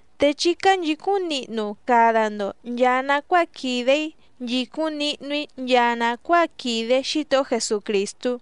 Te chí cánchìcúⁿ nihnu cada‑ndo nchàa nacuáa quìde‑í nchìcúⁿ nihnu‑í nchaa nàcuáa quìde Xítohó Jesucrìstú.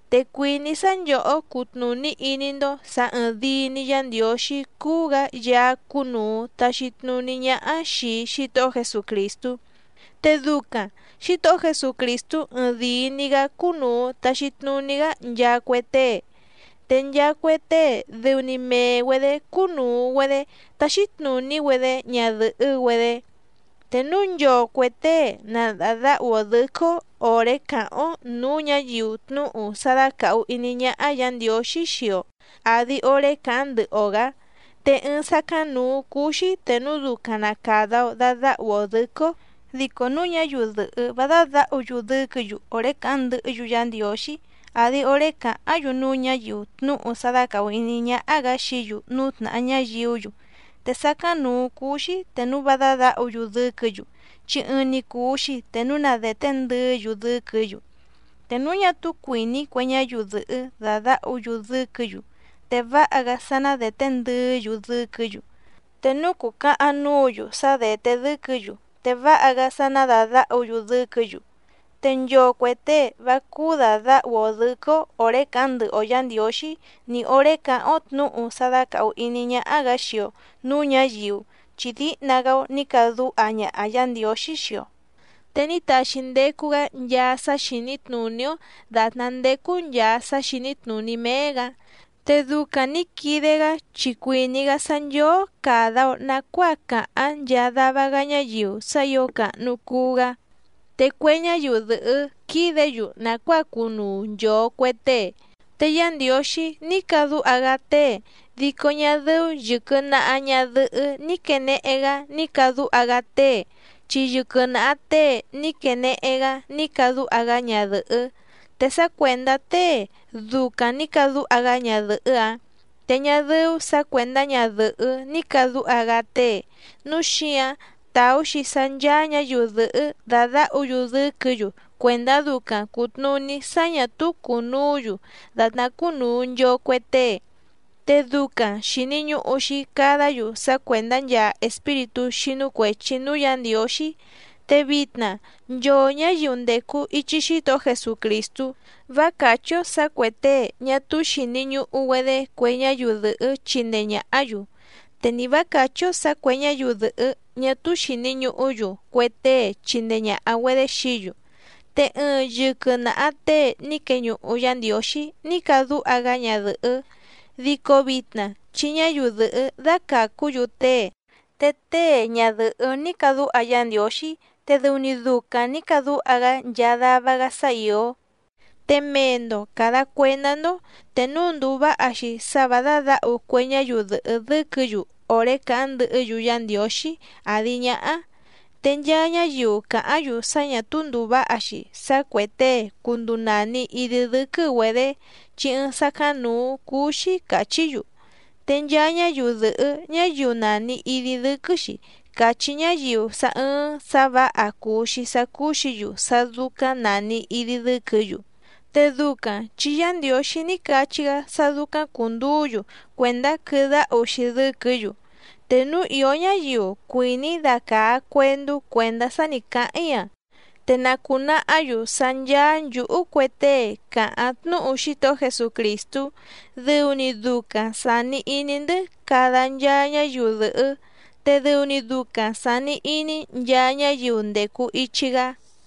Te cuìní‑í sá nchòhó cutnùní iní‑ndó sǎ ɨ̀ɨⁿdii‑ni Yá Ndiǒxí cúú‑gǎ Yaá cúnùu taxi tnuní ñáhá xìi Xítohó Jesucrìstú, te ducaⁿ Xǐtohó Jesucrìstú ɨɨⁿdìi‑ni‑gá cúnùu taxi tnuní‑gá nchaa cue tée, te nchaa cue tée dɨu‑ni mee‑güedě cúnùu‑güedé táxí tnùní‑güedé ñadɨ̀hɨ́‑güedé. Te núu nchoo cuè tée na dàdáhu‑o dɨ̌quɨ́‑ó òré càháⁿ‑ó nǔú ñǎyiu tnúhu sá dácàhu iní ñáhá Yǎ Ndiǒxí xii‑o àdi oré càháⁿ ndɨhɨ‑o‑gǎ, te ɨɨⁿ sácáⁿnǔú cúú‑xí te núu ducaⁿ na càda‑o dadáhu‑o dɨ̌quɨ́‑ó. Dico núu ñáyiu dɨ̀hɨ́ vá dádǎhu‑yu dɨ́quɨ̌‑yu òré càháⁿ ndɨhɨ́‑yu Yá Ndiǒxí, àdi oré càháⁿ‑yu tnúhu sá dácàhu iní ñáhá‑gǎ xií‑yu núú tnàhá ñáyiú‑yu, te sácáⁿnǔú cúú‑xí te núu vá dádǎhu‑yu dɨ́quɨ̌‑yu, chi ɨɨⁿ‑ni cùu‑xi te núu na dèté ndɨɨ́‑yu dɨ́quɨ̌‑yu. Te núu ñá túú cuìní cue ñáyiu dɨ̀hɨ́ dàdáhu‑yu dɨ́quɨ̌‑yu te váha‑gá sá ná dèté ndɨɨ́‑yu dɨ́quɨ̌‑yu. Te núu cùcahaⁿ núǔ‑yu sá dèté dɨ́quɨ̌‑yu te váha‑gá sá ná dàdáhu‑yu dɨ́quɨ̌‑yu. Te nchoo cuè tée vá cúú dàdáhu‑o dɨ̌quɨ́‑ó òré càháⁿ ndɨhɨ‑o Yǎ Ndiǒxí ni òré càháⁿ‑ó tnǔhu sá dácàhu iní ñáhá‑gǎ xii‑o nǔú ñǎyiu chi díhna‑gá‑ó nǐ cadúha ñaha Yǎ Ndiǒxí xii‑o, te ní taxi ndecu‑gá nchaa sá xìní tnùní‑ó dàtná ndécú nchàa sá xìní tnùní méé‑gǎ. Te ducaⁿ nǐ quide‑gá chi cuìní‑gá sá nchóó càda‑o nacuáa cáháⁿ nchaa dava‑gá ñáyiu sá ǐo càhnu cuu‑gá, te cue ñáyiu dɨ̀hɨ́ quídě‑yu nàcuáa cunuu nchòo cue tée. Te Yá Ndiǒxí ní cadúha‑gá tée, dico ñá dɨ́ú yɨ̀quɨ naha ñadɨhɨ́ ní quènehe‑gá ní cadúha‑gá tée chi yɨquɨ naha tée ní quenehe‑gá ní cadúha‑gá ñadɨ̀hɨ́. Te sá cuèndá tée ducaⁿ nǐ cadúha‑gá ñadɨ̀hɨ́‑áⁿ te ñá dɨ́ú sǎ cuèndá ñadɨ̀hɨ́ ní càdúha‑gá tée. Núu xíǎⁿ tàú‑xi sá ncháá ñǎyiu dɨ̀hɨ́ dàdáhu‑yu dɨ́quɨ̌‑yu cuèndá ducaⁿ cùtnuní sá ñà túú cùnuú‑yu dàtná cúnùu nchoo cue tée. Te ducaⁿ xìni ñuhu‑xi cadá‑yu sá cuèndá nchaa espíritú xínú cuèchi núú Yǎ Ndiǒxí. Te vitna nchoo ñǎyiu ndècu ichi Xítohó Jesucrìstú, vá càchí‑ó sǎ cuè tée ñá túú xìni ñuhu‑güedé cue ñáyiu dɨ̀hɨ́ chindee ñàhá‑yu, te ni vǎ càchí‑ó sǎ cuè ñáyiu dɨ̀hɨ́ ñá túú xìni ñuhú‑yu cue tée chindee ñàha‑güedé xií‑yu. Te ɨɨⁿ yɨquɨ naha tée ní queñuhu Yá Ndiǒxí ní cadúha‑gá ñadɨ̀hɨ́, dico vitna chi ñáyiu dɨ̀hɨ́ dácàcú‑yu tée. Te tée, ñadɨ̀hɨ́ ní cadúha Yá Ndiǒxí, te dɨu‑ni ducaⁿ nǐ cadúha‑gá nchaa dava‑gá sá ìó. Te mee‑ndo càda cuendá‑ndó te núu ndùu váha‑xi sá vǎ dádǎhu cue ñáyiu dɨ̀hɨ́ dɨ́quɨ̌‑yu òré càháⁿ ndɨhɨ́‑yu Yá Ndiǒxí àdi ñáhá. Te nchaa ñáyiu càháⁿ‑yu sá ñà túú ndùu váha‑xi sá cuè tée cunduu nàni idi dɨ́quɨ́‑güedě, chi ɨɨⁿ sácáⁿnǔú cúú‑xí càchí‑yu. Te nchaa ñáyiu dɨ̀hɨ́ ñáyiu nàni idi dɨ́quɨ́‑xi càchí ñáyiu sá ɨ̀ɨⁿ sá vǎha cùu‑xi sá cúú‑xǐ‑yu sá dúcáⁿ nàni idi dɨ́quɨ̌‑yu. Te ducaⁿ chi Yá Ndiǒxí ní cachí‑gá sá dúcáⁿ cùnduú‑yu cuèndá quɨdáhu‑xi dɨ́quɨ̌‑yu. Te núu ìó ñáyiu cuìní dacàá cuèndú cuèndá sá nǐ cáháⁿ‑í‑a, te na cùnahá‑yu sá ncháá nchǔhú cue tée càháⁿ tnúhu Xítohó Jesucrìstú dɨu‑ni ducaⁿ sàni iní‑ndɨ́ cada nchaa ñáyiu dɨ̀hɨ́. Te dɨu‑ni ducaⁿ sàni iní nchaa ñáyiu ndècu ichi‑gá.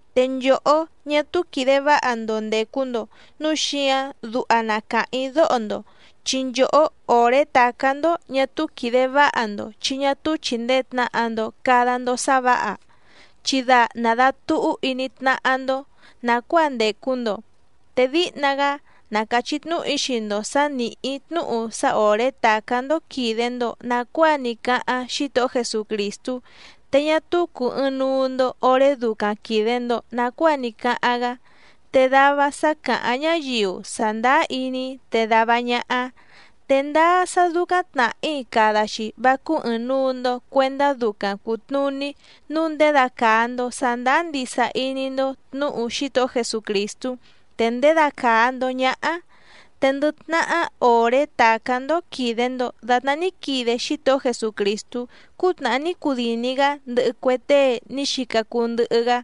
Te nchòhó ñá túú quìde váha‑ndo ndècu‑ndo núu xíǎⁿ duha na càháⁿ‑í dóho‑ndo, chi nchòhó òré tàcá‑ndó ñá túú quìde váha‑ndo chi ñá túú chìndee tnaha‑ndo cada‑ndo sá vǎha, chi da nàdatuhú iní tnáhá‑ndó nàcuáa ndècu‑ndo. Te díhna‑gá na càchí tnúhu‑í xii‑ndo sǎ nìhí‑í tnúhu sá òré tàcá‑ndó quìde‑ndo nacuáa ní cáháⁿ Xítohó Jesucrìstú, te ñá túú cùu ɨɨⁿnuu‑ndo oré ducaⁿ quìde‑ndo nacuáa ní cáháⁿ‑gá. Te dava sá càháⁿ ñáyiu sàndáá iní‑í te dava ñáhá. ¡Te ndáá sá dúcáⁿ tnàhí cada‑xi vá cúú ɨ̀ɨⁿnuu‑ndo cuendá ducaⁿ cùtnuní nǔu ndědacàa‑ndo sandáá ndisa iní‑ndó tnǔhu Xítohó Jesucrìstú te ndědacàa‑ndo ñáhá! Te ndɨ tnahá òré tàcá‑ndó quìde‑ndo datná ní quide Xítohó Jesucrìstú cútnàhá ní cudìni‑gá ndɨhɨ cue tée ní xica cuu ndɨhɨ‑gá,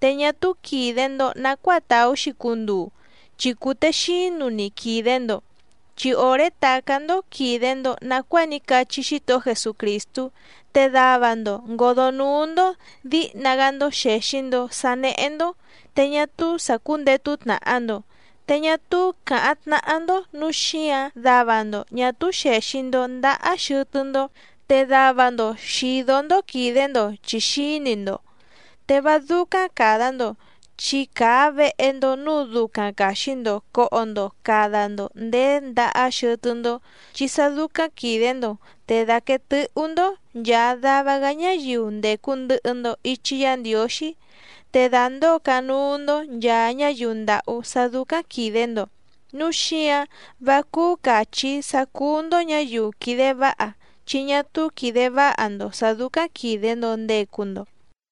te ñá túú quìde‑ndo nacuáa tàú‑xi cunduu chi cùtexínu‑ni quìde‑ndo. Chi òré tàcá‑ndó quìde‑ndo nacuáa ní cachí Xítohó Jesucrìstú, te dava‑ndo ngǒdó núú‑ndó dǐhna‑gá‑ndó xèxi‑ndo sá néhé‑ndó te ñá túú sǎ cúndètu tnaha‑ndo, te ñá túú càháⁿ tnáhá‑ndó nǔu xíǎⁿ dava‑ndo ñà túú xèxi‑ndo ndahá xɨtɨ́‑ndó, te dava‑ndo xìdó‑ndó quìde‑ndo chi xǐni‑ndo. Te vá dúcáⁿ càda‑ndo chi càa vehe‑ndo núú dúcáⁿ càxi‑ndo coho‑ndo cada‑ndo ndéé ndahá xɨtɨ́‑ndó, chi sá dúcáⁿ quìde‑ndo te dàquee tɨ́hú‑ndó nchàa dava‑gá ñáyiu ndècu ndɨhɨ‑ndo ichi Yá Ndiǒxí, te dàndóo canúú‑ndó nchàa ñáyiu ndàhú sá dúcáⁿ quìde‑ndo. ¡Núu xíǎⁿ vá cúú càchí‑í sá cúú‑ndó ñǎyiu quìde váha chi ñá túú quìde váha‑ndo sǎ dúcáⁿ quìde‑ndo ndecu‑ndo!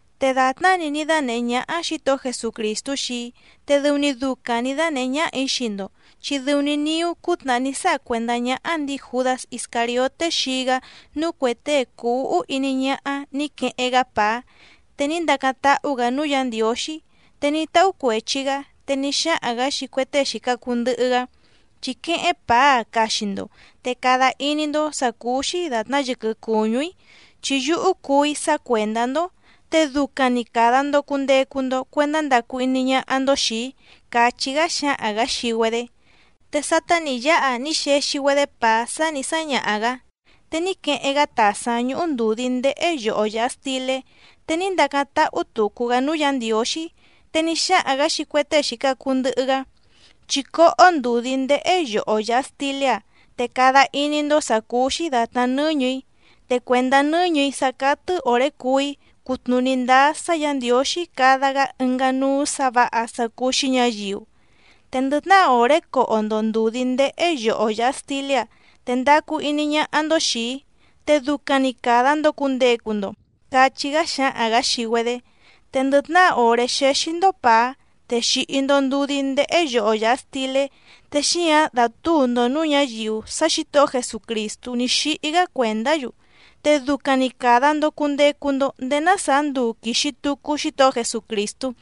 Te dàtná‑ni ní dánèhé ñáhá Xǐtohó Jesucrìstú xii‑í te dɨu‑ni ducaⁿ nǐ dánèhé ñáhà‑í xii‑ndo, chi dɨu‑ni niú cútnàhá ní sáha cuèndá ñáhá ndǐi Jùdás Iscàrioté xii‑gá núú cuè tée cùu úhú iní ñáhá nǐ queheⁿ‑gá pàá, te ní ndacáⁿ táhú‑gǎ núú Yǎ Ndiǒxí, te ní táhú cuèchi‑gá, te ní xáhaⁿ‑gǎ xii cue tée xìca cuu ndɨhɨ‑gá: “Chí quéhéⁿ pàá‑a caxi‑ndo te cada iní‑ndó sǎ cúú‑xí dàtná yɨquɨ cùñú‑í, chi yúhú cuú‑í sácuèndá‑ndó. Te ducaⁿ‑ni càda‑ndo cundecu‑ndo cuendá ndacu iní ñáhá‑ndó xìi‑í”, càchí‑gá xǎhaⁿ‑gǎ xii‑güedé. Te sátá nǐ yáha ní xexi‑güedé pàá sá nǐ sáñaha‑gǎ, te ní queheⁿ‑gá tàsáⁿ ñúhú ndùdí ndéhé yoho yàha stilé, te ní ndacáⁿ táhú tùcu‑gá núú Yǎ Ndiǒxí. Te ní xáhaⁿ‑gǎ xii cue tée xìca cuu ndɨhɨ‑gá: “Chí cóhó ndùdí ndéhé yoho yàha stilé‑a, te cada iní‑ndó sǎ cúú‑xí dàtná nɨ́ñɨ̀‑í, te cuèndá nɨ́ñɨ̀‑í sá cátɨ́ òré cuú‑í cutnùní ndáá sá Yǎ Ndiǒxí cada‑gá ɨngá núú sǎ vǎha sá cúú‑xí ñǎyiu. Te ndɨ tnahá òré coho‑ndo ndùdí ndéhé yoho yàha stilé‑áⁿ te ndacu iní ñáhá‑ndó xìi‑í, te ducaⁿ‑ni càda‑ndo cundecu‑ndo”, cachí‑gá xǎhaⁿ‑gǎ xii‑güedé. Te ndɨ tnahá òré xéxí‑ndó pàá te xìhi‑ndo ndudí ndéhé yoho yàha stilé, te xíǎⁿ dátǔu‑ndo nǔú ñǎyiu sá Xǐtohó Jesucrìstú ní xíhí‑gá cuèndá‑yu, te ducaⁿ‑ni càda‑ndo cundecu‑ndo ndéé ná sàá nduu quìxi tucu Xítohó Jesucrìstú.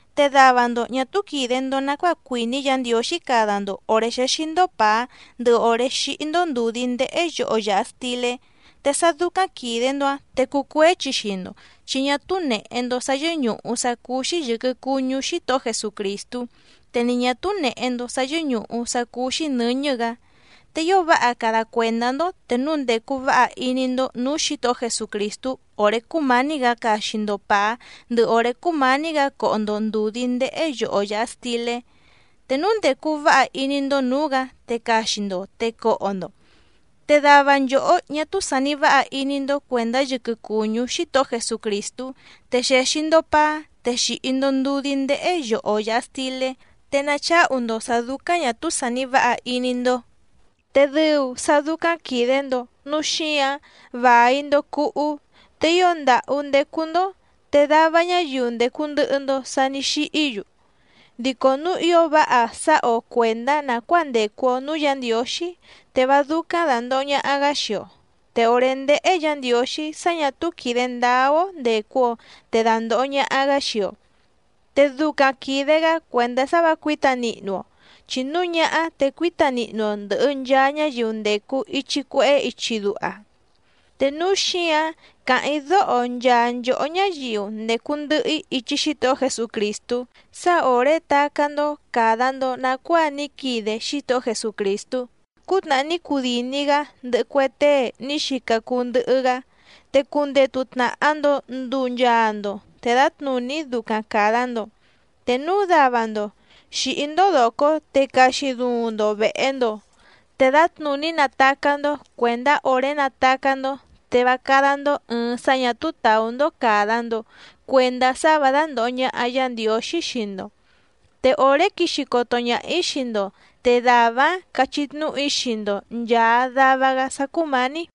Te dava‑ndo ñà túú quìde‑ndo nacuáa cuìní Yǎ Ndiǒxí cada‑ndo òré xéxí‑ndó pàá ndɨhɨ òré xíhí‑ndó ndùdí ndéhé yoho yàha stilé, te sá dúcáⁿ quìde‑ndo‑áⁿ te cucuéchi xii‑ndo chi ñá túú nèhe‑ndo sá yɨ́ñùhu sá cúú‑xí yɨ̀quɨ cuñú Xítohó Jesucrìstú, te ni ñà túú nèhe‑ndo sá yɨ́ñùhu sá cúú‑xí nɨ̌ñɨ́‑gǎ. Te ío váha cada cuèndá‑ndó te núu ndècu váha iní‑ndó nǔú Xǐtohó Jesucrìstú òré cúmǎní‑gǎ caxi‑ndo pàá ndɨhɨ òré cúmǎní‑gǎ coho‑ndo ndùdí ndéhé yoho yàha stilé. Te núu ndècu váha iní‑ndó nǔú‑gǎ te caxi‑ndo te coho‑ndo. Te dava nchòhó ñá túú sàni váha iní‑ndó cuèndá yɨquɨ cùñú Xítohó Jesucrìstú te xèxi‑ndo paá te xìhi‑ndo ndudí ndéhé yoho yàha stilé, te nacháhu‑ndo sǎ dúcáⁿ ñà túú sàni váha iní‑ndó. Te dɨu sá dúcáⁿ quìde‑ndo núu xíǎⁿ vài‑ndo cuhú, te ío ndàhú ndécú‑ndó, te dava ñáyiu ndècu ndɨhɨ‑ndo sa ní xíhí‑yu. Dico núu ío váha sáha‑o cuèndá nàcuáa ndècu‑o núú Yǎ Ndiǒxí, te vá dúcáⁿ dàndoho ñaha‑gá xii‑o. Te òré ndéhé Yǎ Ndiǒxí sá ñà túú quìde ndáá‑ó ndècu‑o te dàndoho ñaha‑gá xii‑o. Te ducaⁿ quìde‑gá cuèndá sá vǎ cuǐta nihnu‑o, chi núu ñáhá te cuíta nihnu‑o ndɨ̀hɨ nchaa ñáyiu ndècu ichi cuehé ichi duha. Te núu xíǎⁿ càháⁿ‑í dóho nchaa nchòhó ñáyiu ndècu ndɨhɨ‑í ichi Xítohó Jesucrìstú sá òré tacá‑ndó càda‑ndo nacuáa ní quide Xítohó Jesucrìstú cútnàhá ní cudìni‑gá ndɨhɨ cue tée ní xica cuu ndɨhɨ‑gá, te cundetu tnàha‑ndo nduu nchaa‑ndo te dǎtnùní ducaⁿ càda‑ndo. Te núu dava‑ndo xìhí‑ndó dòcó te caxi duuⁿ‑ndo vèhe‑ndo te dǎtnùní natacá‑ndó, cuèndá òré natacá‑ndó te vá cádá‑ndó ɨ̀ɨⁿ sá ñà túú tàú‑ndó càda‑ndo cuendá sá vǎ dándòho ñaha Yá Ndiǒxí xii‑ndo. Te òré quixi coto ñaha‑ǐ xii‑ndo te dàvá‑áⁿ cachí tnúhu‑í xii‑ndo nchàa dava‑gá sá cúmǎní.